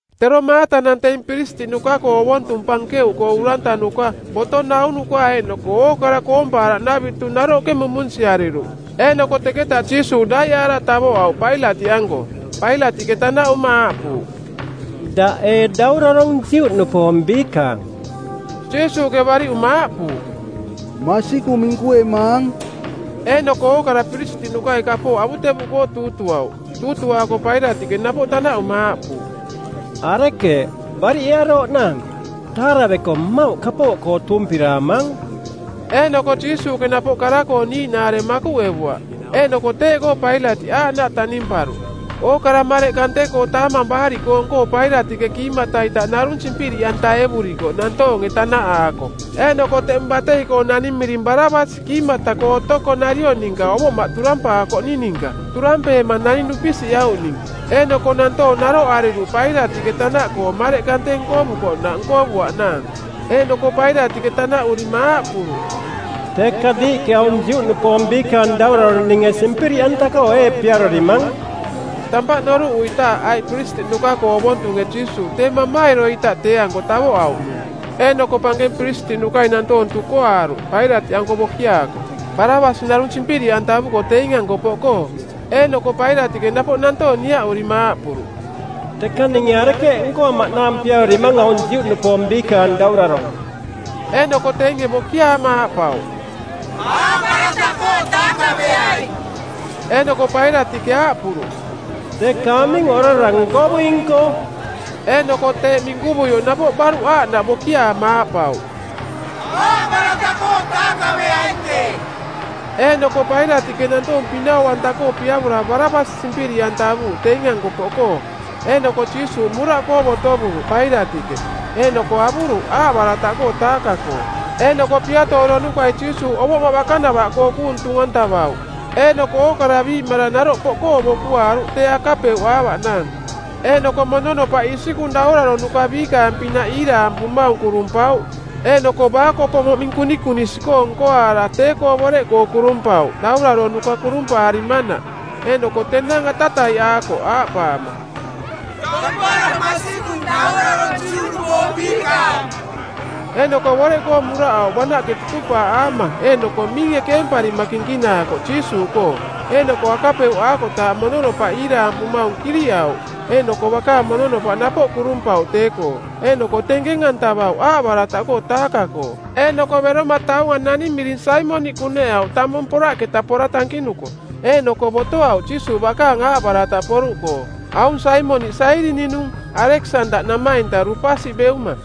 Tero maatanang teing piristiꞌnuka-koo ovontung pankeuꞌkoo urantanuka, boto naunuka eeꞌnoko ookara koompaaraꞌnavitu naroꞌke mumunsiariruꞌ. Eeꞌnoko teketa Jiisuuꞌ daiꞌaara tavoꞌauꞌ Pailatiꞌanko. Pailatiꞌke tanaꞌuma aaꞌpuuꞌ, “Daꞌ ee Daurarong˜ Juꞌnupoong Biikaang?” Jiisuuꞌke bariꞌuma aaꞌpuuꞌ, “Masikung minkuemaang.” Eeꞌnoko ookara piristiꞌnukai kapooꞌ avutevuꞌkoo tuutuauꞌ. Tuutuaako Pailatiꞌke napoꞌ tanaꞌuma aaꞌpuuꞌ, “Arekeeꞌ, bariꞌearooꞌnaang? Taaraveko mmauꞌ kapooꞌkoo tuumpiraamaang.” Eeꞌnoko Jiisuuꞌke napoꞌ kara-koo niiꞌnaare makuꞌevuaꞌ. Eeꞌnoko teeꞌkoo Pailatiꞌ aaꞌnaꞌ taꞌnimparuꞌ. Ookara mareꞌ kante-koo Taamang Baariꞌkoong-koo˜ Pailatiꞌke kiimata-ita narung simpiriꞌantaevurikoꞌ nantoonge tanaꞌaako. Eeꞌnoko teꞌmung batei-koo naning miring Barabasi kiimata-koo otoko nariong ninka ovoꞌmaꞌ turampaakoꞌning ninka, turampeema naning dupisiꞌauꞌning. Eeꞌnoko nantoong naroꞌariruꞌ Pailatiꞌke tanaꞌkoo mareꞌ kante nkovukoꞌnaꞌ nkovuaꞌnaang. Eeꞌnoko Pailatiꞌke tanaꞌurima aaꞌpuruꞌ, “Teka diiꞌke aung Juꞌnupoong Biikaang Daurarong ninge simpiriꞌanta-koo ee piarorimang?” Tampaꞌ noruꞌuitaaꞌ aiꞌ piristiꞌnuka-koo ovontunge Jiisuuꞌ tee mamairo-ita tee-anko tavoꞌauꞌnung. Eeꞌnoko pankeng piristiꞌnukai nantoong tukoaaruꞌ Pailatiꞌanko bokiaako, Barabasi narung simpiriꞌantavuko teing-anko poꞌkoo. Eeꞌnoko Pailatiꞌke napoꞌ nantoong niaꞌurima aaꞌpuruꞌ, “Teka ninge arekeeꞌ nkoamaꞌnaang piarorimaang aung Juꞌnupoong Biikaang Daurarong?” Eeꞌnoko teinge bokiaama aaꞌpauꞌ, “Aaꞌbarataꞌkoo taakaveaing.” Eeꞌnoko Pailatiꞌke aaꞌpuruꞌ, “Teka aming orara nkovuing-koo?” Eeꞌnoko teeꞌ minkuvuioꞌ napoꞌ baruꞌ aaꞌnaꞌ bokiaama aaꞌpauꞌ, “Aaꞌbarataꞌkoo taakaveaing tee.” Eeꞌnoko Pailatiꞌke nantoong pinau-anta-koo piavora Barabasi simpiriꞌantavuuꞌ teing-anko poꞌkoo. Eeꞌnoko Jiisuuꞌ muraꞌkoo botovuruꞌ Pailatiꞌke, eeꞌnoko avuruꞌ aaꞌbarataꞌkoo taaka-koo. Eeꞌnoko piatooronukai Jiisuuꞌ ovoꞌmaꞌ bakanavaꞌkoo kuung tung-antavauꞌ. Eeꞌnoko ookara biiꞌmarang naroꞌ poꞌkoo bokuaaruꞌ tee akapeuꞌaavaꞌnaang. Eeꞌnoko mononopaꞌ isikung dauraronuka biikaang-pinaꞌ iiraampumaung kurumpauꞌ, eeꞌnoko baakopo moꞌming kunikunisi-koo nkoaara tee-koo boreꞌkoo kurumpauꞌ dauraronuka kurumpaarimanaꞌ. Eeꞌnoko tenang atataiꞌaakoꞌ aaꞌpaama, “Tampara masikung, Daurarong Juꞌnupoong Biikaang!” Eeꞌnoko boreꞌkoo muraꞌauꞌ banaꞌke tutupaaꞌaama, eeꞌnoko miinge keemparima kinkinaakoꞌ Jiisuuꞌkoo. Eeꞌnoko akapeuꞌaakotaaꞌ mononopaꞌ iiraampumaung kiruꞌauꞌ, eeꞌnoko bakaang mononopaꞌ napoꞌ kurumpauꞌ tee-koo. Eeꞌnoko tenkeng-antavauꞌ aaꞌbarataꞌkoo taaka-koo. Eeꞌnoko beroma taunga naning miring Saimoniꞌ kuneꞌauꞌ tamung poraꞌketa pora tankinuko, eeꞌnoko botoauꞌ Jiisuuꞌ bakaang aaꞌbarataꞌ poruꞌkoo. Aung Saimoniꞌ Sairini-nung, Aleksandaꞌ namainta Ruupasi beuma.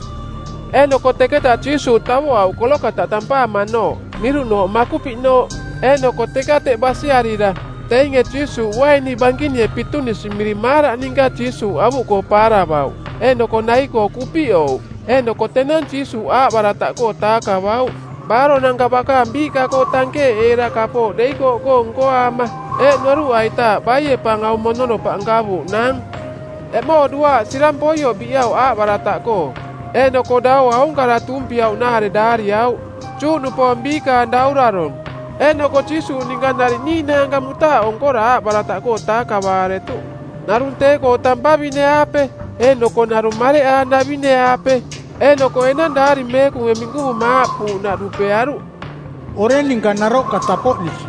Eeꞌnoko teketa Jiisuuꞌ tavoꞌauꞌ Kolokataꞌ tampaamanooꞌ, miruꞌnooꞌ Makupiꞌnooꞌ. Eeꞌnoko teka teꞌ basiarira, teinge Jiisuuꞌ uaini bankinie pitunisi miring maaraꞌ ninka Jiisuuꞌ avuꞌkoo paaravauꞌ. Eeꞌnoko nai-koo kupiꞌouꞌ. Eeꞌnoko tenang Jiisuuꞌ aaꞌbarataꞌkoo taakavauꞌ. Baaronanka bakaang biiꞌka-koo tankeeꞌeera kapooꞌ deikooꞌkoong nkoaama, eeꞌ noruꞌaitaaꞌ baie pa aung mononopaꞌ nkavuuꞌnaang? Eꞌmoo duaaꞌ sirang poioꞌ biꞌauꞌ aaꞌbarataꞌkoo. Eeꞌnoko daua aung kara tuumpiauꞌnaare daariauꞌ, JUꞌNUPOONG BIIKAANG DAURARONG. Eeꞌnoko Jiisuuꞌ ninka nariꞌ niiꞌnaanka mutaaꞌo nkora aaꞌbarataꞌkoo taakavaaretuꞌ, narung tee-koo tampavine-aape, eeꞌnoko narung mareꞌaanavine-aape. Eeꞌnoko enang Daari Meekunge minkuvuma aaꞌpuuꞌnaꞌ dupearuꞌ, “Oreng ninka naroꞌka tapoꞌnisi.”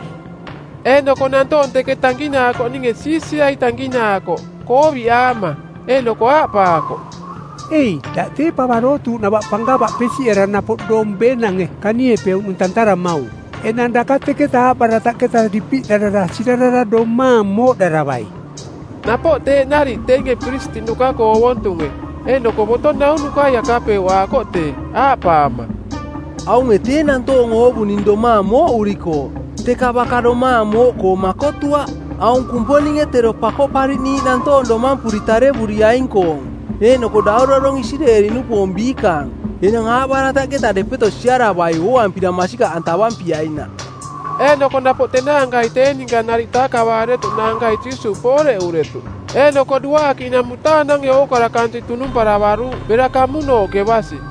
Eeꞌnoko nantoong teke tankinaakoꞌninge siisiai tankinaakoꞌ, kooviꞌaama. Eeꞌnoko aaꞌpaakoꞌ, “Ei, daꞌ tee pava dootuuꞌnava pankava pesiꞌera napoꞌ doong beenange kaniepeuꞌnung tantaramaung. Enang daka teketa aaꞌbarataꞌketa dipiꞌdarara sirarara domaang mooꞌdaravai!” Napoꞌ teeꞌ nariꞌ teinge piristiꞌnuka-koo ovontunge, eeꞌnoko boto naunukai akapeuꞌaakoꞌ tee, aaꞌpaama, “Aunge tee nantoong oovuning domaang mooꞌurikooꞌ, teka baka domaang mooꞌkoo makotuaꞌ. Aung Kumponinge tero Pakoꞌpariꞌniiꞌ nantoong domampuri tarevuriaing-koong, eeꞌnoko Daurarong Isireeli-nupoong Biikaang, enang aaꞌbarataꞌketa depeto siaravai ooampira masikaꞌantavampiainaꞌ.” Eeꞌnoko napoꞌ tenaanka tee ninka nariꞌ taakavaaretuꞌnaankai Jiisuuꞌ pooreꞌuretuꞌ. Eeꞌnoko duaakiꞌnang mutaanange ookara kansiꞌ tunumparavaruuꞌ bera kamunooꞌke basi.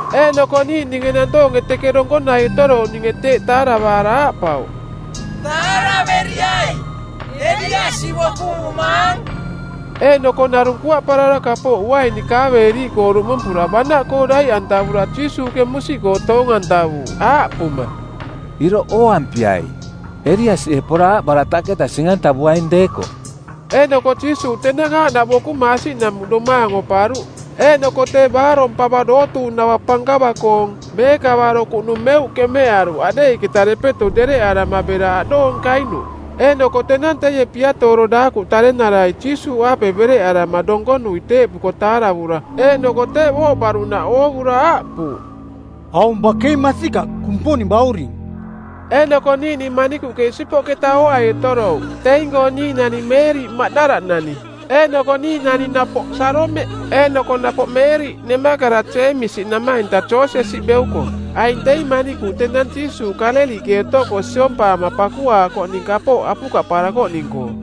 Eeꞌnoko niiꞌninge nantoonge teke donkonai otorouꞌninge teeꞌ taravaara aaꞌpauꞌ, “Taaraveriai. Eliasi bokuvumaang.” Eeꞌnoko narung kuaꞌparara kapooꞌ uaini kaaveeriiꞌkoo duꞌmumpura banaꞌkoo daiꞌantavura Jiisuuꞌke musiꞌkoo toong-antavuuꞌ aaꞌpuma, “Iroꞌ ooampiai, Eliasie pora aaꞌbarataꞌketa sing-antavuaing deekoꞌ.” Eeꞌnoko Jiisuuꞌ tenang aaꞌnaꞌ bokuma asiꞌnamuꞌ domaang oparuꞌ. Eeꞌnoko tee baarong pava dootuuꞌnava pankava-koong, meekavaro kuꞌnung, meuꞌ keꞌmeꞌaruꞌ aꞌdeiꞌketa depeto dereꞌarama bera aꞌdoong kainuꞌ. Eeꞌnoko tenang teie piatooro daakuꞌ tarenarai Jiisuuꞌaape bereꞌarama donkonui teeꞌpuko taaravura eeꞌnoko teeꞌ booꞌparuꞌnaꞌ oovura aaꞌpuuꞌ, “Aung bakei masikaꞌ Kumponing Bauring!” Eeꞌnoko niiꞌning manikuꞌke isipoꞌketa ooai otorouꞌ. Teing-koo niiꞌnani Meeriꞌ Maꞌdala-nani, eeꞌnoko niiꞌnani napoꞌ Saalomeꞌ, eeꞌnoko napoꞌ Meeriꞌ nemakara Jeemisi namainta Joosesi beuko. Aing teing manikuꞌ tenang Jiisuuꞌ Kaaleliꞌke otoko siompaama pakuaakoꞌning kapooꞌ apukaꞌparakoꞌning-koo.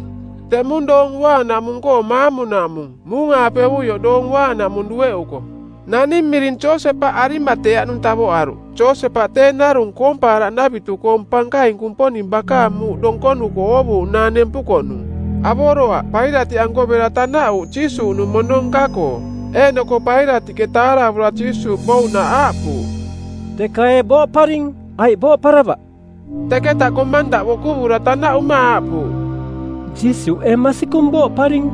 Teꞌmung Doong Uaanaꞌmung-koo maamunaꞌmung, muung-aapevuioꞌ Doong Uaanaꞌmung dueꞌuko, naning miring Josepaꞌ Arimateaꞌnung tavoꞌaruꞌ. Josepaꞌ tee narung koompaaraꞌnavitu-koong pankaing Kumponing bakaang muuꞌ donkonuko oovuuꞌnaang nempukoꞌnung; Avoroaꞌ Pailatiꞌanko bera tanaꞌuuꞌ Jiisuuꞌnung mono nka-koo. Eeꞌnoko Pailatiꞌke taaravura Jiisuuꞌ bouꞌnaꞌ aaꞌpuuꞌ, “Teka ee booꞌparing, aiꞌ booꞌparavaꞌ?” Teketa komandaꞌ bokuvura tanaꞌuma aaꞌpuuꞌ, “Jiisuuꞌ ee masikung booꞌparing?”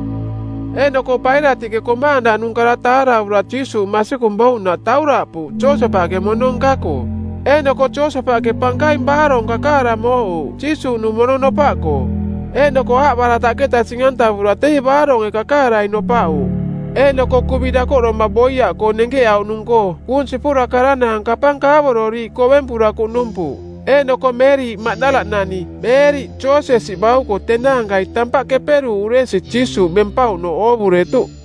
Eeꞌnoko Pailatiꞌke komandaꞌnung kara taaravura Jiisuuꞌ masikung bouꞌnaꞌ tauraꞌpuuꞌ Josepaꞌke mono nka-koo. Eeꞌnoko Josepaꞌke pankaing baarong kakaara mooꞌuuꞌ Jiisuuꞌnung mono nopaꞌkoo, eeꞌnoko aaꞌbarataꞌketa sing-antavura teie baaronge kakaarai nopaꞌuuꞌ. Eeꞌnoko kuvi dakoꞌdoma boiaꞌkoong nenkeꞌauꞌnung-koo kuung sipura karanaang kapang kaavororiiꞌ kovempura kuꞌnumpuuꞌ. Eeꞌnoko Meeriꞌ Maꞌdalanani, Meeriꞌ Joosesi bauko tenaankai tampaꞌ keperuuꞌ uresi Jiisuuꞌ bempauꞌnooꞌ oovuretuꞌ.